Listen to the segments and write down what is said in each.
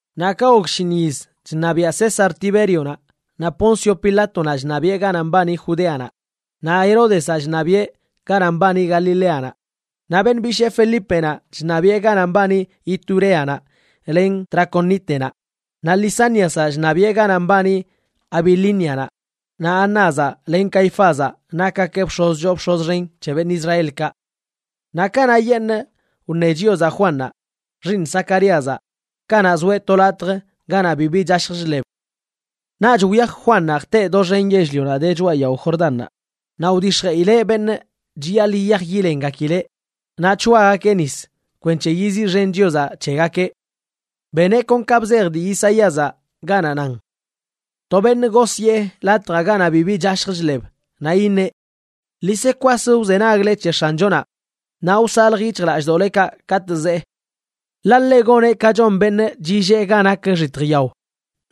Naꞌ ka gok shinꞌ yiz chṉabiaꞌ César Tibérionaꞌ, naꞌ Poncio Pilátonaꞌ chṉabiꞌe ganaꞌ mbani Judéanaꞌ, naꞌ Heródezaꞌ chṉabiꞌe ganaꞌ mbani Galileanaꞌ, naꞌ beṉꞌ bishee Felípenaꞌ chṉabiꞌe ganaꞌ mbani Ituréanaꞌ len Traconítenaꞌ, naꞌ Lisániazaꞌ chṉabiꞌe ganaꞌ mbani Abilínianaꞌ, naꞌ Anázaꞌ len Caifázaꞌ nakgakeꞌ bx̱oz choo bx̱oz xen c̱he beṉꞌ Israelkaꞌ. Naꞌ kanaꞌyeṉꞌ wṉe Chiozaꞌ Juannaꞌ, xiiṉ Zacaríazaꞌ, kanaꞌ zoeꞌ to latj ganaꞌ bibi chashj chḻeb. Naꞌch wyaj Juannaꞌ jteꞌ doxen yell-lionaꞌ de choꞌa yao Jordánnaꞌ naꞌ wdix̱jeꞌileꞌ beṉꞌ chiyaḻꞌ yiyaj yilengakileꞌ naꞌ c̱hoagakeꞌ nis kwenc̱he yiziꞌxen Chiozaꞌ c̱hegakeꞌ. Beneꞌ kon ka bzej dii Isaíazaꞌ ganaꞌ nan: To beṉꞌ gosyee latjaꞌ ganaꞌ bibi chashj chḻeb, naꞌ iṉeꞌ: “Ḻi se kwas wzenagle c̱he X̱anchonaꞌ naꞌ wsalj yic̱hjlallꞌdoꞌlekaꞌ katꞌ zee. Ḻaꞌ ḻeꞌ goneꞌ ka chon beṉꞌ chillee ga nak xitj yao,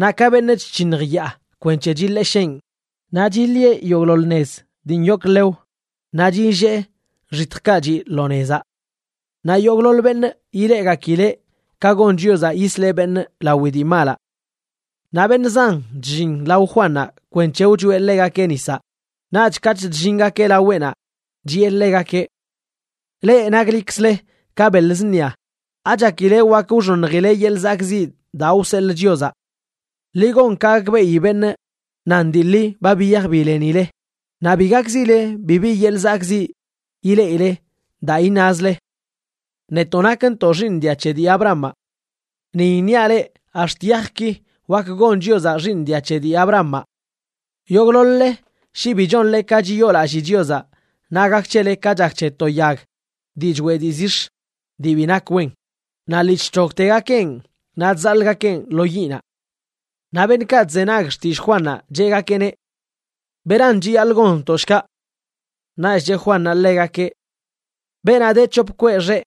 naꞌ ka beṉꞌ chc̱hiṉj yaa kwenc̱he chiḻesheꞌn. Naꞌ chiḻieꞌ yogꞌḻoḻ nez dii nyok nḻew, naꞌ chillee xitjkaꞌ chiꞌ lo nezaꞌ. Naꞌ yogꞌḻoḻ beṉꞌ ileꞌgakileꞌ ka gon Chiozaꞌ yisleꞌ beṉꞌ lawi dii malaꞌ.” Naꞌ beṉꞌ zan chllin lao Juannaꞌ kwenc̱he wchoeꞌ ḻegakeꞌ nisaꞌ, naꞌch katꞌ chllingakeꞌ laweꞌnaꞌ, chiꞌe ḻegakeꞌ: ―¡Leꞌ naklikzle ka beḻ zṉia! ¿Achakile wak wxoṉjileꞌ yeḻꞌ zakꞌziꞌ daa wseḻꞌ Chiozaꞌ? Ḻi gon ka gakbeꞌi beṉꞌ nan dii ḻi ba biyaj bilenileꞌ. Naꞌ bi gakzile bibi yeḻꞌ zakꞌziꞌ ileꞌile daa iṉazle: “Netoꞌ nakntoꞌ xiiṉ dia c̱he dii Abrahamaꞌ.” Ni iṉiaꞌ leꞌ ax̱t yajki wak gon Chiozaꞌ xiiṉ dia c̱he dii Abrahamaꞌ. Yogꞌḻoḻ-le shi bi chonle ka chiyoolallii Chiozaꞌ naꞌ gak c̱hele ka chak c̱he to yag dii choeꞌ dii zix̱ dii bi nak wen, naꞌ lii chc̱hogtegakeꞌn naꞌ chzaḻꞌgakeꞌn lo yiꞌnaꞌ. Naꞌ beṉꞌkaꞌ chzenag xtillꞌ Juannaꞌ cheꞌgakeꞌneꞌ: ―¿Beran chiyaḻꞌ gonntoꞌ, shkaꞌ? Naꞌch cheꞌ Juannaꞌ ḻegakeꞌ: ―Beenaꞌ de c̱hop kweꞌ xeꞌ,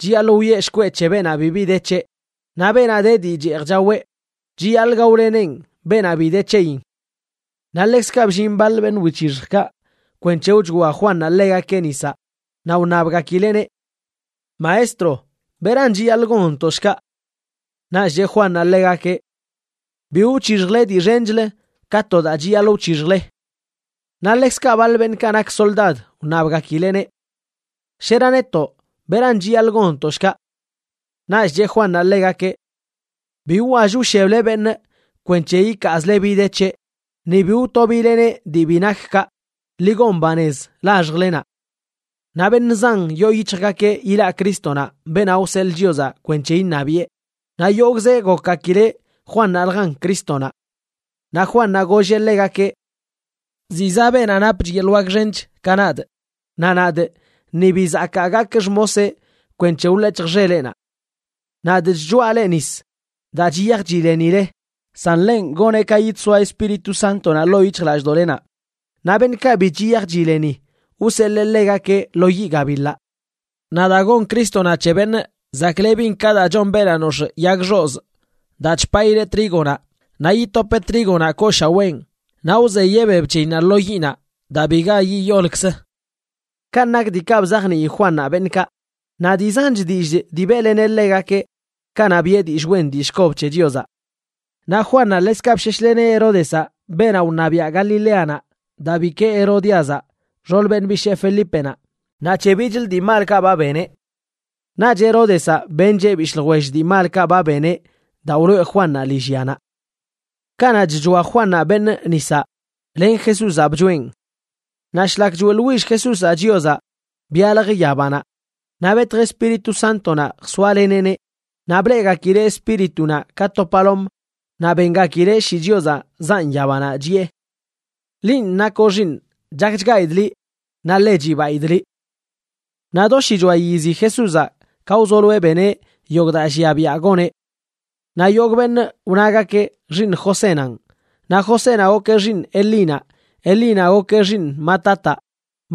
chiyaḻꞌ wiꞌe shkweꞌ c̱he beenaꞌ bi de c̱heꞌ. Naꞌ beenaꞌ de dii cheej chaweꞌ, chiyaḻꞌ gaoleneꞌn beenaꞌ bi de c̱heyin. Naꞌ ḻekzkaꞌ bllin baḻ beṉꞌ wic̱hixjkaꞌ kwenc̱he wchoa Juannaꞌ ḻegakeꞌ nisaꞌ, naꞌ wṉabgakileꞌneꞌ: ―Maestro, ¿beran chiyaḻꞌ gonntoꞌ, shkaꞌ? Naꞌch cheꞌ Juannaꞌ ḻegakeꞌ: ―Bi wc̱hixjle dii xenchlə ka to daa chiyaḻꞌ wc̱hixjle. Naꞌ ḻekzkaꞌ baḻ beṉꞌkaꞌ nak soldad wṉabgakileꞌneꞌ: ―¿Shera netoꞌ, beran chiyaḻꞌ gonntoꞌ shkaꞌ? Naꞌch cheꞌ Juannaꞌ ḻegakeꞌ: ―Bi wwall wsheble beṉꞌ kwenc̱he ikaazle bi de c̱heꞌ, ni bi wtobileneꞌ dii bi nak kaꞌ. Ḻi gon banez laxjlenaꞌ. Naꞌ beṉꞌ zan yoo yic̱hjgakeꞌ ilaꞌ Crístonaꞌ, beenaꞌ wseḻꞌ Chiozaꞌ kwenc̱he iṉabiꞌe, naꞌ yogꞌzeꞌ gokgakileꞌ Juannaꞌljan Crístonaꞌ. Naꞌ Juannaꞌ golleꞌ ḻegakeꞌ: ―Ziꞌ zaꞌ beenaꞌ napch yeḻꞌ wak xench ka nadꞌ. Naꞌ nadꞌ ni bi zakaa gakꞌ xmoseꞌ kwenc̱he wḻec̱hjꞌ xeleꞌnaꞌ. Nadꞌ chchoaꞌ leꞌ nis daa chiyaj chilenile, san ḻenꞌ goneꞌ ka yidsoa Espíritu Sántonaꞌ ḻoo yic̱hjlallꞌdoꞌlenaꞌ, naꞌ beṉꞌkaꞌ bi chiyaj chileni, wseḻee ḻegakeꞌ lo yiꞌ gabiḻaꞌ. Naꞌ daa gon Crístonaꞌ c̱he beṉꞌ chzaklebin ka daa chon beenaꞌ nox̱ꞌ yag xozꞌ daa chpaꞌileꞌ trígonaꞌ, naꞌ yitopeꞌ trígonaꞌ kooshaween naꞌ wzeyeꞌ beb c̱heyinnaꞌ lo yiꞌnaꞌ daa biga yiyolkzə. Kanꞌ nak diikaꞌ bzajnii Juannaꞌ beṉꞌkaꞌ, naꞌ dii zanch dillꞌ dii beꞌleneꞌ ḻegakeꞌ kanaꞌ biꞌe dillꞌ wen dillꞌ kob c̱he Chiozaꞌ. Naꞌ Juannaꞌ ḻekzkaꞌ bsheshleneꞌ Heródezaꞌ, beenaꞌ wṉabiaꞌ Galileanaꞌ, daa bikee Herodíazaꞌ, xool beṉꞌ bishee Felípenaꞌ, naꞌ c̱he bichlə dii malkaꞌ ba beneꞌ. Naꞌch Heródezaꞌ bencheꞌ bishꞌ ljwell dii malkaꞌ ba beneꞌ daa wloꞌe Juannaꞌ lillyanaꞌ. Kanaꞌ chchoa Juannaꞌ beṉꞌ nisaꞌ, len Jesúzaꞌ bchoeꞌn. Naꞌ shlak choeꞌḻwill Jesúzaꞌ Chiozaꞌ, byalj yabanaꞌ naꞌ betj Espíritu Sántonaꞌ jsoaleneꞌneꞌ, naꞌ bleꞌgakileꞌ Espíritunaꞌ ka to palom. Naꞌ bengakileꞌ shii Chiozaꞌ zaꞌn yabanaꞌ, chiꞌe: ―Linꞌ nakoꞌ Xiiṉꞌ, chakchgaidꞌ liꞌ naꞌ ḻe chibaidꞌ liꞌ. Naꞌ do shichoa yizi Jesúzaꞌ ka wzoloeꞌ beneꞌ yogꞌ daa llia biaꞌ goneꞌ. Naꞌ yogꞌ beṉꞌ wnagakeꞌ xiiṉ Josénanꞌ. Naꞌ Josénaꞌ gokeꞌ xiiṉ Elínaꞌ, Elínaꞌ gokeꞌ xiiṉ Matataꞌ,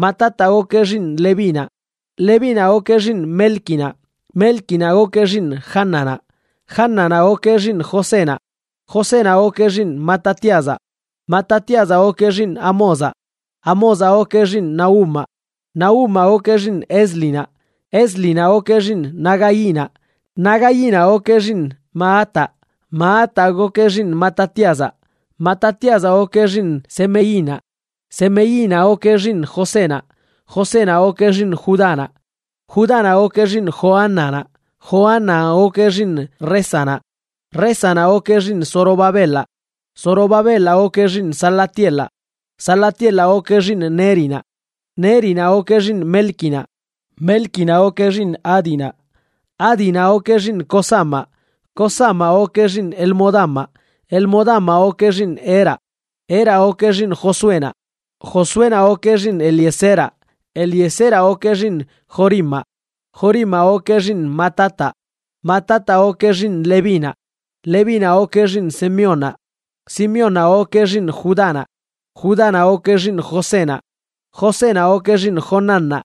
Matataꞌ gokeꞌ xiiṉ Levínaꞌ, Levínaꞌ gokeꞌ xiiṉ Mélquinaꞌ, Mélquinaꞌ gokeꞌ xiiṉ Jánanaꞌ, Jánanaꞌ gokeꞌ xiiṉ Josénaꞌ. Josénaꞌ gokeꞌ xiiṉ Matatíazaꞌ, Matatíazaꞌ gokeꞌ xiiṉ Amózaꞌ, Amózaꞌ gokeꞌ xiiṉ Nahumaꞌ, Nahumaꞌ gokeꞌ xiiṉ Éslinaꞌ, Éslinaꞌ gokeꞌ xiiṉ Nagainaꞌ. Nagainaꞌ gokeꞌ xiiṉ Maataꞌ, Maataꞌ gokeꞌ xiiṉ Matatíazaꞌ, Matatíazaꞌ gokeꞌ xiiṉ Semeinaꞌ, Semeinaꞌ gokeꞌ xiiṉ Josénaꞌ, Josénaꞌ gokeꞌ xiiṉ Judánaꞌ. Judánaꞌ gokeꞌ xiiṉ Joánanaꞌ, Joánanaꞌ gokeꞌ xiiṉ Résanaꞌ, Résanaꞌ gokeꞌ xiiṉ Zorobabelaꞌ, Zorobabelaꞌ gokeꞌ xiiṉ Salatielaꞌ, Salatielaꞌ gokeꞌ xiiṉ Nérinaꞌ. Nérinaꞌ gokeꞌ xiiṉ Mélquinaꞌ, Mélquinaꞌ gokeꞌ xiiṉ Ádinaꞌ, Ádinaꞌ gokeꞌ xiiṉ Cosamaꞌ, Cosamaꞌ gokeꞌ xiiṉ Elmodamaꞌ, Elmodamaꞌ gokeꞌ xiiṉ Eraꞌ. Eraꞌ gokeꞌ xiiṉ Josuénaꞌ, Josuénaꞌ gokeꞌ xiiṉ Eliezeraꞌ, Eliezeraꞌ gokeꞌ xiiṉ Jorimaꞌ, Jorimaꞌ gokeꞌ xiiṉ Matataꞌ. Matataꞌ gokeꞌ xiiṉ Levínaꞌ, Levínaꞌ gokeꞌ xiiṉ Simeónnaꞌ, Simeónnaꞌ gokeꞌ xiiṉ Judánaꞌ, Judánaꞌ gokeꞌ xiiṉ Josénaꞌ, Josénaꞌ gokeꞌ xiiṉ Jonánnaꞌ,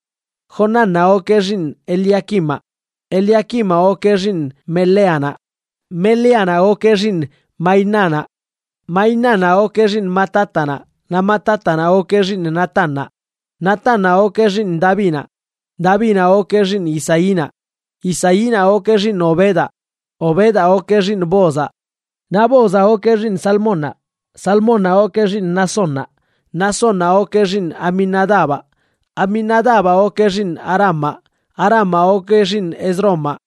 Jonánnaꞌ gokeꞌ xiiṉ Eliaquimaꞌ. Eliaquimaꞌ gokeꞌ xiiṉ Meleanaꞌ, Meleanaꞌ gokeꞌ xiiṉ Mainánaꞌ, Mainánaꞌ gokeꞌ xiiṉ Matátanaꞌ, naꞌ Matátanaꞌ gokeꞌ xiiṉ Natánnaꞌ. Natánnaꞌ gokeꞌ xiiṉ Davinaꞌ, Davinaꞌ gokeꞌ xiiṉ Isaínaꞌ, Isaínaꞌ gokeꞌ xiiṉ Obedaꞌ, Obedaꞌ gokeꞌ xiiṉ Boozaꞌ, naꞌ Boozaꞌ gokeꞌ xiiṉ Salmónnaꞌ, Salmónnaꞌ gokeꞌ xiiṉ Naasónnaꞌ. Naasónnaꞌ gokeꞌ xiiṉ Aminadabaꞌ, Aminadabaꞌ gokeꞌ xiiṉ Aramaꞌ, Aramaꞌ gokeꞌ xiiṉ Ezromaꞌ,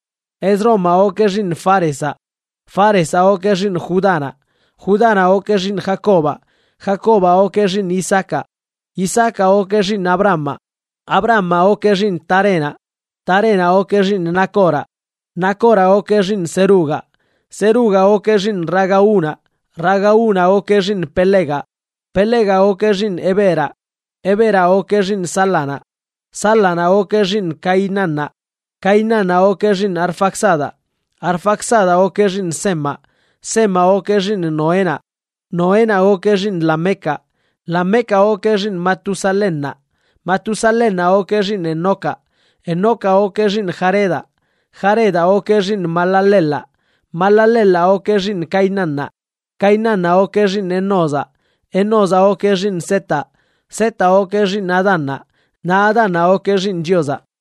Ezromaꞌ gokeꞌ xiiṉ Fárezaꞌ, Fárezaꞌ gokeꞌ xiiṉ Judánaꞌ. Judánaꞌ gokeꞌ xiiṉ Jacobaꞌ, Jacobaꞌ gokeꞌ xiiṉ Isaacaꞌ, Isaacaꞌ gokeꞌ xiiṉ Abrahamaꞌ, Abrahamaꞌ gokeꞌ xiiṉ Tarénaꞌ, Tarénaꞌ gokeꞌ xiiṉ Nacoraꞌ. Nacoraꞌ gokeꞌ xiiṉ Serugaꞌ, Serugaꞌ gokeꞌ xiiṉ Ragaunaꞌ, Ragaunaꞌ gokeꞌ xiiṉ Pelegaꞌ, Pelegaꞌ gokeꞌ xiiṉ Heberaꞌ, Heberaꞌ gokeꞌ xiiṉ Sálanaꞌ. Sálanaꞌ gokeꞌ xiiṉ Cainánnaꞌ, Cainánnaꞌ gokeꞌ xiiṉ Arfaxadaꞌ, Arfaxadaꞌ gokeꞌ xiiṉ Semaꞌ, Semaꞌ gokeꞌ xiiṉ Noénaꞌ, Noénaꞌ gokeꞌ xiiṉ Lamecaꞌ. Lamecaꞌ gokeꞌ xiiṉ Matusalénnaꞌ, Matusalénnaꞌ gokeꞌ xiiṉ Enocaꞌ, Enocaꞌ gokeꞌ xiiṉ Jaredaꞌ, Jaredaꞌ gokeꞌ xiiṉ Mahalaleelaꞌ, Mahalaleelaꞌ gokeꞌ xiiṉ Cainánnaꞌ. Cainánnaꞌ gokeꞌ xiiṉ Enózaꞌ, Enózaꞌ gokeꞌ xiiṉ Setaꞌ, Setaꞌ gokeꞌ xiiṉ Adánnaꞌ, naꞌ Adánnaꞌ gokeꞌ xiiṉ Chiozaꞌ.